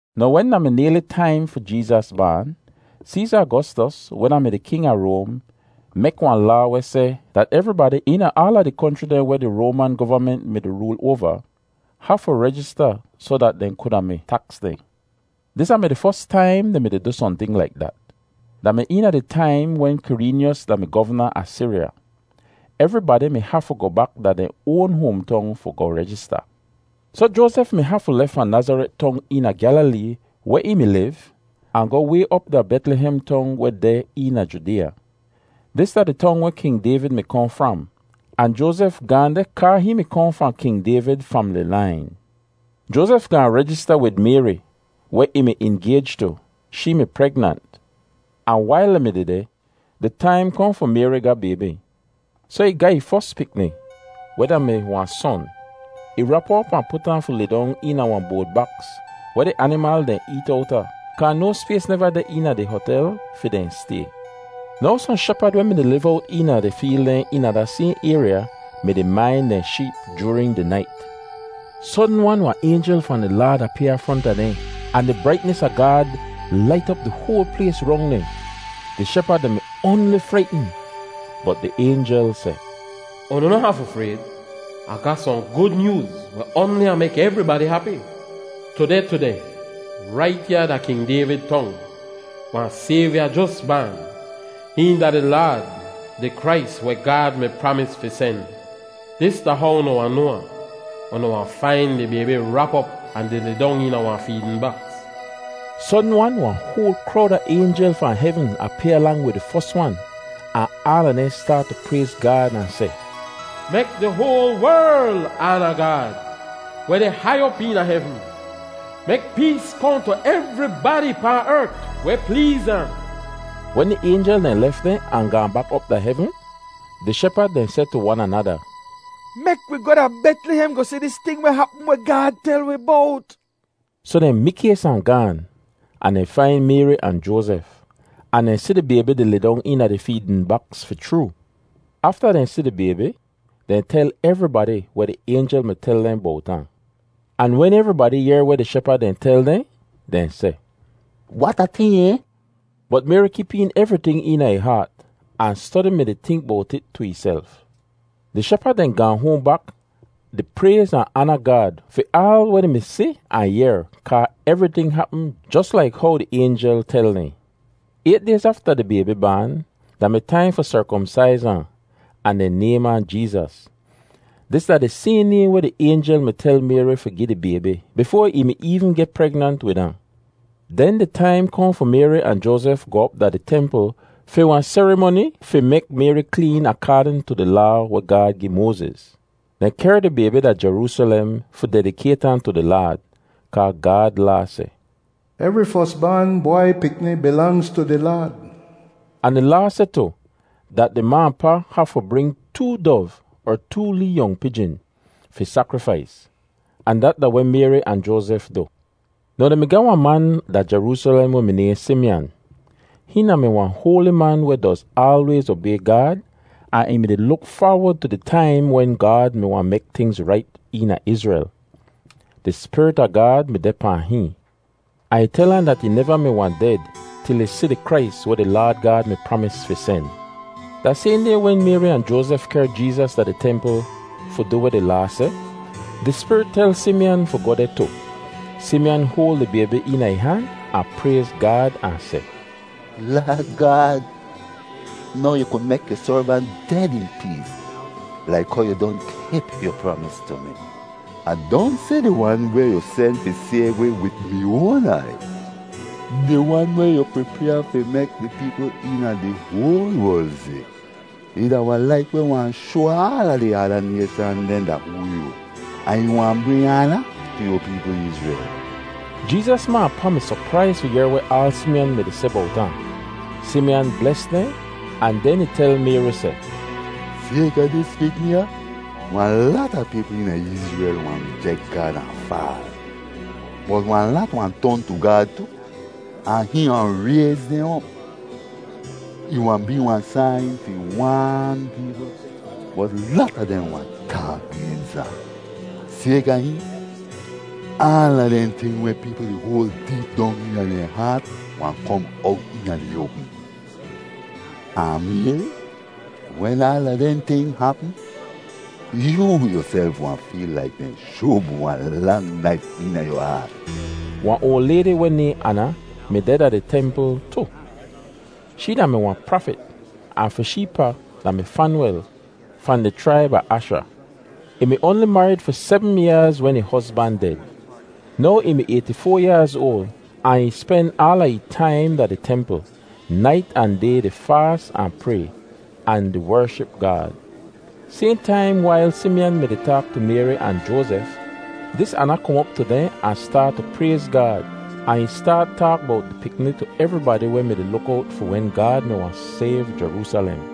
Now, wen da mi nayli taim fi Jeezas baan, Seeza Agostos, weh da-mi di king a Roam, mek wahn laa weh seh dat evribadi eena aala di konchri dehn weh di Roaman govament mi-di rool oava, hafu rejista soh dat dehn kuda mi taks dehn. Dis da-mi di fos taim dehn mi-di du sohnting laik dat. Da mi eena di taim wen Kireenyos da-mi govna a Siriya. Evribadi mi hafu goh bak da dehn oan hoamtong fi goh rejista. Soh Joazef mi hafu lef fahn Nazaret Tong eena Gyalilee weh ih mi liv, ahn goh way op da Betlihem Tong weh deh eena Judeeya. Dis da di tong weh King Dayvid mi kohn fram, ahn Joazef gaahn deh kaa hihn mi kohn fahn King Dayvid famili lain. Joazef gaahn rejista wid Mayri, weh ih mi ingayj tu. Shee mi pregnant, ahn wail dehn mi dehdeh, di taim kohn fi Mayri ga baybi. Soh ih ga ih fos pikni, weh da-mi wahn son. Ih rap ahn op ahn put ahn fi lidong eena wahn boad baks weh di animal dehn eet owta kaa no spays neva deh eena di hotel fi dehn stay. Now, sohn shepad weh mi-di liv owt eena di feel dehn eena da sayhn ayrya mi-di main dehn sheep joorin di nait. Sodn-wan wahn aynjel fahn di Laad apyaa fronta dehn ahn di braitnis a Gaad lait op di hoal plays rong dehn. Di shepad dehn mi oanli fraitn. Bot di aynjel seh, “Unu noh hafu frayd. Ah ga sohn gud nyooz weh oanli wahn mek evribadi hapi. Tudeh tudeh, rait ya da King Dayvid tong, wahn Sayvya jos baan. Hihn da di Laad, di Krais weh Gaad mi pramis fi sen. Dis da how unu wahn noa ahn: Unu wahn fain di baybi rap op ahn di lidong eena wahn feedn baks.” Sodn-wan wahn hoal krowd a aynjel fahn hevn apyaa lang wid di fos wan, ahn aala dehn staat tu prayz Gaad ahn seh, “Mek di hoal werl aana Gaad, weh deh hai op eena hevn! Mek pees kohn tu evribadi pahn ert weh pleez ahn.” Wen di aynjel dehn lef dehn ahn gaahn bak op da hevn, di shepad dehn seh tu wan anada, “Mek wi goh da Betlihem goh si dis ting weh hapm weh Gaad tel wi bowt.” Soh dehn mikays ahn gaan, ahn dehn fain Mayri ahn Joazef, ahn dehn si di baybi di lidong eena di feedn baks fi chroo. Afta dehn si di baybi, dehn tel evribadi weh di aynjel mi tel dehn bowt ahn. Ahn wen evribadi yehr weh di shepad dehn tel dehn, dehn seh, “Wat a ting, ay!” Bot Mayri kip een evriting eena ih haat, ahn stodi mi-di tink bowt it tu ihself. Di shepad dehn gaahn hoahn bak di prayz ahn aana Gaad fi aal weh dehn mi si ahn yehr kaa evriting hapm jos laik how di aynjel tel dehn. Ayt dayz afta di baybi baan, da mi taim fi serkomsaiz ahn, ahn dehn naym ahn Jeezas. Dis da di sayhn naym weh di aynjel mi tel Mayri fi gi di baybi bifoa ih mi eevn geh pregnant wid ahn. Den di taim kohn fi Mayri ahn Joazef goh op da di templ fi wahn serimoni fi mek Mayri kleen akaadn tu di Laa weh Gaad gi Moaziz. Dehn kehr di baybi da Jeroosalem fi dedikayt ahn tu di Laad, kaa Gaad Laa seh, “Evri fos baan bwai pikni bilangz tu di Laad.” Ahn di Laa seh tu dat di ma ahn pa hafu bring “too dov er too lee yong pijin” fi sakrifais; ahn dat da weh Mayri ahn Joazef du. Now dehn mi ga wahn man da Jeroosalem weh mi nayhn Simiyan. Hihn da-mi wahn hoali man weh doz aalwayz obay Gaad ahn ih mi-di luk faawod tu di taim wen Gaad mi wahn mek tingz rait eena Izrel. Di Spirit a Gaad mi deh pahn hihn, ahn ih tel ahn dat ih neva mi wahn ded til ih si di Krais weh di Laad Gaad mi pramis fi sen. Da sayhn day wen Mayri ahn Joazef kehr Jeezas da di templ fi du weh di Laa seh, di Spirit tel Simiyan fi goh deh tu. Simiyan hoal di baybi eena ih han ahn prayz Gaad ahn seh, “Laad Gaad, now yu ku mek yu servant ded in pees, laik how yu don kip yu pramis tu mi. Ah don si di Wan weh yu sen fi sayv wi wid mi oan aiy, di Wan weh yu pripyaa fi mek di peepl eena di hoal werl si. Ih da wahn Lait weh wahn shoa aala di ada nayshan dehn da hoo yoo, ahn ih wahn bring aana tu yu peepl Izrel.” Jeezas ma ahn pa mi sopraiz fi yehr weh aal Simiyan mi-di seh bowt ahn. Simiyan bles dehn, ahn den ih tel Mayri seh, “Sayka dis pikni ya, wahn lata peepl eena Izrel wahn rijek Gaad ahn faal, bot wahn lat wahn ton tu Gaad tu, ahn hihn wahn rayz dehn op. Ih wahn bee wahn sain fi waan peepl, bot lata dehn wahn taak gens ahn. Sayka hihn, aala dehn ting weh peepl di hoal deep dong eena dehn haat wahn kom owt eena di oapm. Ahn Mayri, wen aala dehn ting hapm, yoo yuself wahn feel laik dehn shub wahn lang naif eena yu haat.” Wahn oal laydi weh nayhn Ana, mi deh da di templ tu. Shee da-mi wahn prafit, ahn fi shee pa da-mi Fanwel fahn di chraib a Asha. Ih mi oanli marid fi sebm yaaz wen ih hozban ded. Now ih mi ayti-foa yaaz oal ahn ih spen aala ih taim da di templ, nait ahn day di faas ahn pray, ahn di wership Gaad. Sayhn taim wail Simiyan mi-di taak tu Mayri ahn Joazef, dis Ana kom op tu dehn ahn staat tu prayz Gaad, ahn ih staat taak bowt di pikni tu evribadi weh mi-di luk owt fi wen Gaad mi wahn sayv Jeroosalem.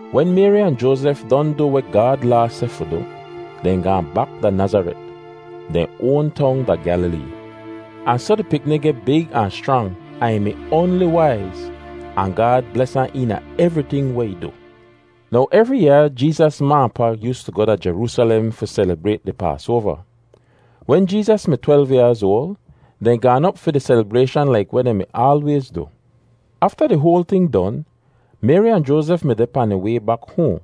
Wen Mayri ahn Joazef don du weh Gaad Laa seh fi du, dehn gaahn bak da Nazaret, dehn oan tong da Gyalilee. Ahn soh di pikni geh big ahn schrang, ahn ih mi oanli waiz. Ahn Gaad bles ahn eena evriting weh ih du. Now evri yaa Jeezas ma ahn pa yoostu goh da Jeroosalem fi selibrayt di Paasoava. Wen Jeezas mi twelv yaaz oal, dehn gaan op fi di selibrayshan laik weh dehn mi aalwayz du. Afta di hoal ting don, Mayri ahn Joazef mi deh pahn dehn way bak hoahn.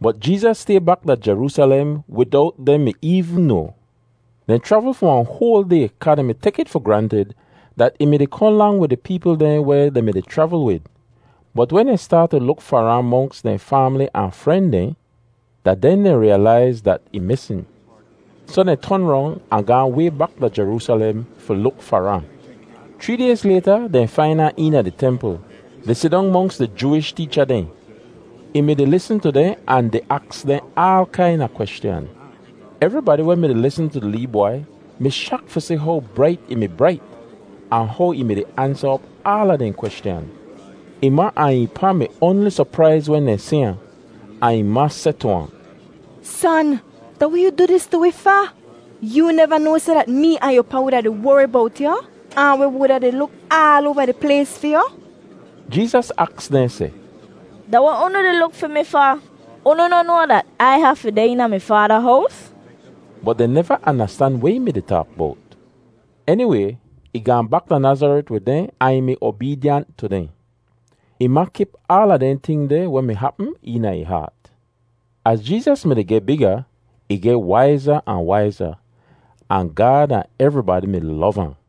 Bot Jeezas stay bak da Jeroosalem widowt dehn mi eevn noa. Dehn chravl fi wahn hoal day kaa dehn mi tek it fi grantid dat ih mi-di kohn lang wid di peepl dehn weh dehn mi-di chravl wid. Bot wen dehn staat tu luk far ahn monks dehn faamli ahn fren dehn, da den dehn riyalaiz dat ih misn. Soh dehn ton rong ahn gaahn way bak da Jeroosalem fi luk far ahn. Chree dayz layta dehn fain ahn eena di templ, di sidong monks di Jooish teecha dehn. Ih mi-di lisn tu dehn ahn di aks dehn aal kaina kweschan. Evribadi weh mi-di lisn tu di lee bwai mi shak fi si how brait ih mi brait, ahn how ih mi-di ansa op aala dehn kweschan. Ih ma ahn ih pa mi oanli sopraiz wen dehn si ahn, ahn ih ma seh tu ahn, “Son, da weh yu du dis tu wi fa? Yoo neva noa seh dat mee ahn yu pa wuda di wori bowt yu, ahn wi wuda di luk aal oava di plays fi yu?” Jeezas aks dehn seh, “Da weh unu di luk fi mi fa? Unu noh noa dat Ai hafu deh eena mi Faada hows?” Bot dehn neva andastan weh ih mi-di taak bowt. Eniway, ih gaahn bak da Nazaret wid dehn ahn ih mi obeedyant tu dehn. Ih ma kip aala dehn ting deh weh mi hapm eena ih haat. Az Jeezas mi-di geh biga, ih geh waiza ahn waiza, ahn Gaad ahn evribadi mi lov ahn.